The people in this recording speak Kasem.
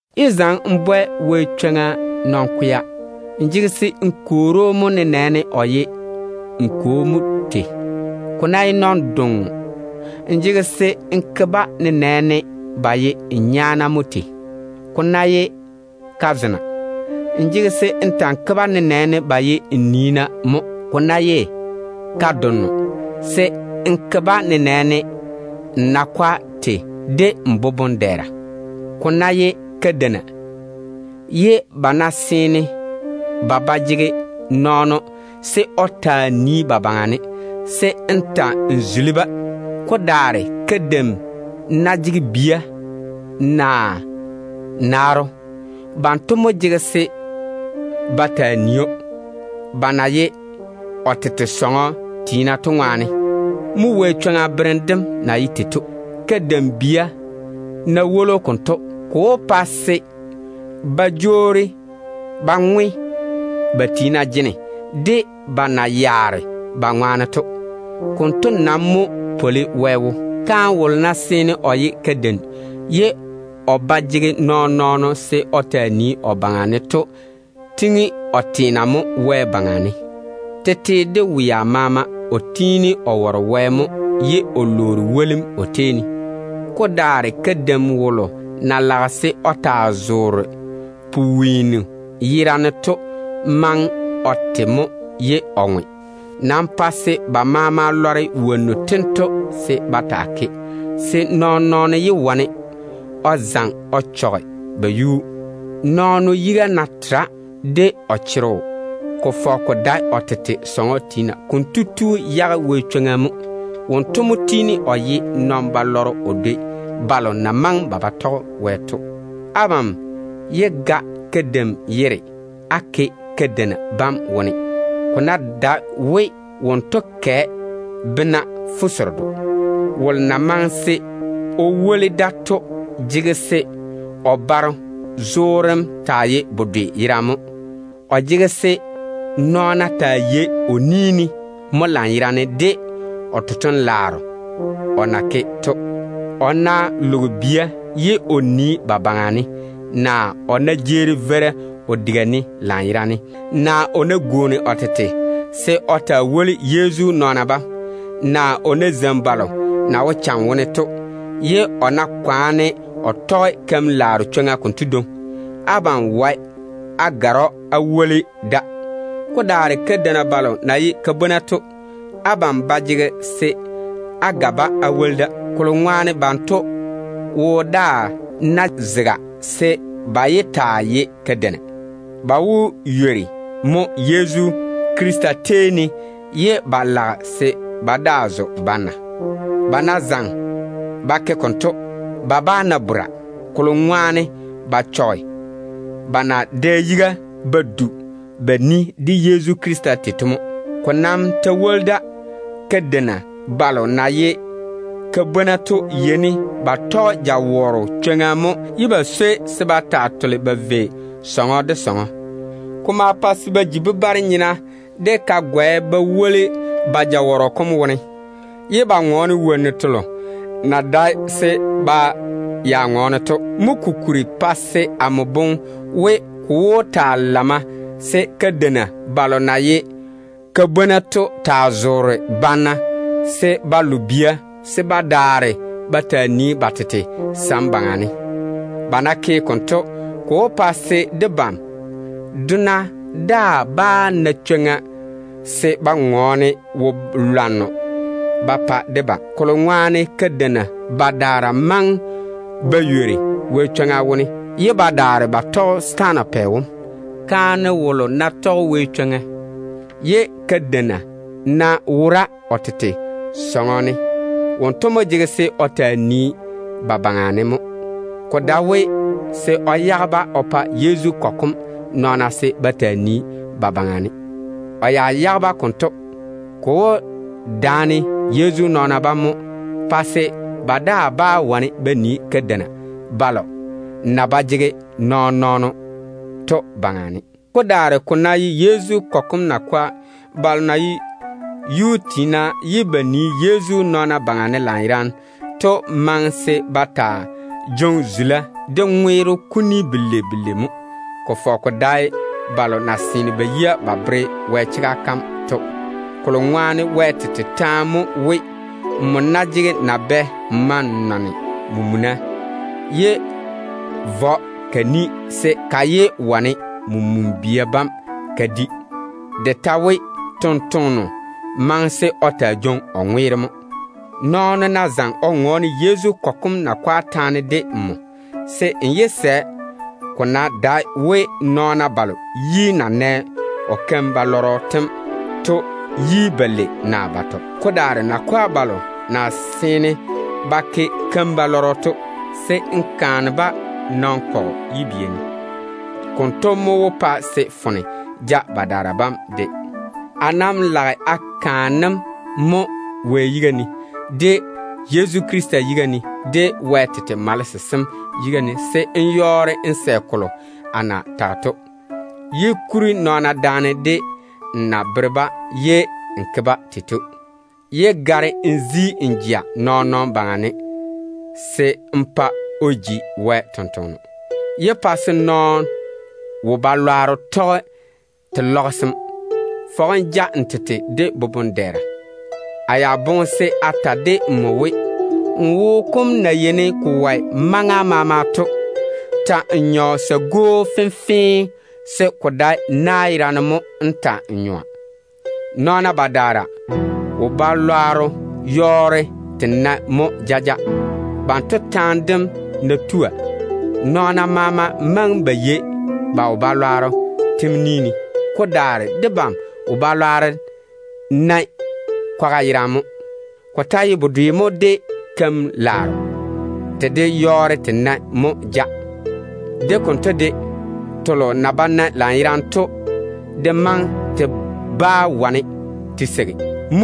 Yé zaŋe n bwɛ Wɛ chwoŋa nɔn-kwea. N jege se n kwoori‑o mo, nenɛɛne o ye n kwo mo tei. Ko ná ye nɔn-donno, n jege se n ke-ba nenɛɛne ba ye n nyaana mo tei. Ko ta ná ye kazena, se n ta‑n ke-ba nenɛɛne ba ye n niina mo. Ko ná ye ka-donno, se n ke-ba nenɛɛne n nakɔa tei de n boboŋ-dɛɛra. Ko ná ye kadeina, ye ba ná seene ba ba jege nɔɔno se o taa nii ba baŋa ne, se n ta‑n zuli-ba. Ko daare kadeim ná jege bia naa naaro, banto mo jege se ba taa nii‑o, ba na ye o tete sɔŋɔ tiina to ŋwaane. Mo Wɛ chwoŋa berem dem na ye tei to. Kadeim bia ná woli‑o konto, ko wó pa se ba jwoori ba ŋwe ba tiina jene de ba na yaare ba ŋwaane to. Konto nam mo pwoli Wɛ wo. Kaane wolo nam ná seene o ye kadeim ye o ba jege nɔɔn-nɔɔno se o taa nii o baŋa ne, kotu daŋe o teena Wɛ baŋa ne mo. Tete de wea maama o tiini o ware Wɛ mo ye o lwoori wolim o tei ne. Ko daare kadeim wolo na lage ka jaŋa kikia yerane to maŋe o te mo ye o ŋwe. Nam pa se ba maama lɔre wonnu tento se ba taa ke, se nɔɔn-nɔɔno yé wane o zaŋe o yaale ba yuu. Nɔɔno yiga ná tera de o chorro, ko fɔge ko dae o tete sɔŋɔ tiina, konto tu ywori Wɛ chwoŋa kam wone mo. Wonto mo tiini o ye nɔn-balɔrɔ o dwoi balo na maŋe ba ba tɔge Wɛ to. Abam yé ga kadeim yere á woli kadeina yera yam wone, ko ná dae we wonto kɛ bena fuseredo. Wolo na maŋe se o woli da to jege se o baro zoorem taa ye bedwe yerane mo. Ko maŋe se nɔɔna taa yei o ni ne mo de totoŋ-laaro o na jege o ke to. O ná loge bia ye o nii ba baŋa ne, naa o ná jeeri veira o diga ne lanyerane, naa o ná gwooni o tete se o taa woli Yezu nɔɔna bam, naa o ná zeini balo na wo cham wone to, ye o ná yɔɔre o tɔge keim-laaro chwoŋa konto dwoŋi, abam wae á gare‑o á woli da. Ko daare kadeina balo na ye ka-bwona to, abam ba jege se á ga-ba á woli da. Kolo ŋwaane banto wo daa ná zaga se ba yé taa ye kadeina, ba wó ywori mo Yezu Krista tei ne ye ba lage se ba daa zo banna. Ba ná zaŋe ba ke konto, ba bá na bora, kolo ŋwaane ba chɔge ba na dɛ yiga ba du ba ni de Yezu Krista tei to mo. Ko nam ta woli da, kadeina balo na ye ka-bwona to yeini ba tɔge jawɔrɔ chwoŋa mo, ye ba swoi se ba taa tole ba vei sɔŋɔ de sɔŋɔ. Ko ma pa se ba ji bebare-nyena de ka-gɔɛ ba woli ba jawɔrɔ kom wone, ye ba ŋɔɔne wonnu telo na dae se ba ya ŋɔɔne to. Mo kokuri pa se amo boŋe we, ko wó ta lamma se kadeina balo na ye ka-bwona to taa zoore banna se ba lo bia se ba daare ba taa nii ba tete sam baŋa ne. Ba ná ke konto, ko wó pa se wolo na done debam to daa bá na chwoŋa se o twe debam. Kolo ŋwaane kadeina badaara maŋe ba ywori Wɛ chwoŋa wone ye ba daare ba tɔge setaana pɛ wom. Kaane wolo ná tɔge Wɛ chwoŋa, ye kadeina ná wora o tete sɔŋɔ ne, konto tu mo jege se o taa nii ba baŋa ne mo. Ko dae se o yage-ba o pa Yezu kɔgɔ kom nɔɔna se ba taa nii ba baŋa ne. O ná yage-ba konto, ko wó daane Yezu nɔɔna bam mo, pa se ba daa bá wane ba nii kadeina balo na ba jege nɔɔn-nɔɔno to baŋa ne. Ko daare ko ná ye Yezu kɔgɔ kom nakwa balo na ye yuu tiina ye ba nii Yezu nɔɔna baŋa ne lanyerane to maŋe se ba taa jwoŋi zula de ŋweero kuni belei belei mo, ko fɔge ko dae balo na seene ba yia ba bere Wɛ chega kam to. Kolo ŋwaane ko popone Wɛ tɔnɔ kom wone mo we, “Nmo ná jege nabea n ma n toŋe n faao, yé vɔ ka ni se ka yé wane men-bia bam ka di.” Ko ta popone we, “Tontoŋeno maŋe se o taa jwoŋi o ŋweero mo.” Nɔɔno ná zaŋe o ŋɔɔne Yezu kɔgɔ kom nakwe taane de nmo, se n yé sɛ, ko ná dae we nɔɔna balo yi na nɛ o keim-balwaaro tem to yi balei naa batɔ. Ko daare nakwa balo na seene ba ke keim-balwaaro to, se n bwɛ-ba nɔn-kɔgɔ kom yibia ne. Konto mo wó pa se foone ja badaara bam de. A nam lage a kaane‑m mo Wɛ yiga ne, de Yezu Krista yiga ne, de Wɛ tete malese sem yiga ne, se n yɔɔre n sɛ kolo a na tage to. Yé kuri nɔɔna daane de n na bere-ba ye n ke-ba tei to. Yé gare n zi n jea nɔɔn-nɔɔno baŋa ne se n pa o ji Wɛ tontoŋeno. Yé pa se nɔɔno keim-balwaaro tɔge te lɔgese‑m. Fɔge n ja n tete de boboŋ-dɛɛra ye tusim tera. A ya boŋe se a ta de nmo we, n wo kom na yeini ko wɔe maŋa maama to, ta‑n nyɔ sa-gwoo fenfee, se ko dae na yerane mo nmo wó ta‑n nyɔa. Nɔɔna badaara wo-balwaaro yɔɔre te nae mo jaja. Banto taane dem ná tua, nɔɔna maama maŋe ba yei ba wo-balwaaro tem ni ne. Ko daare babam wo-balwaaro nae kwaga yerane mo. Ko ta ye bedwe mo de keim-laaro, te de yɔɔre te nae mo ja. De konto de, telo na ba nae lanyerane to de maŋe te bá wane te seigi.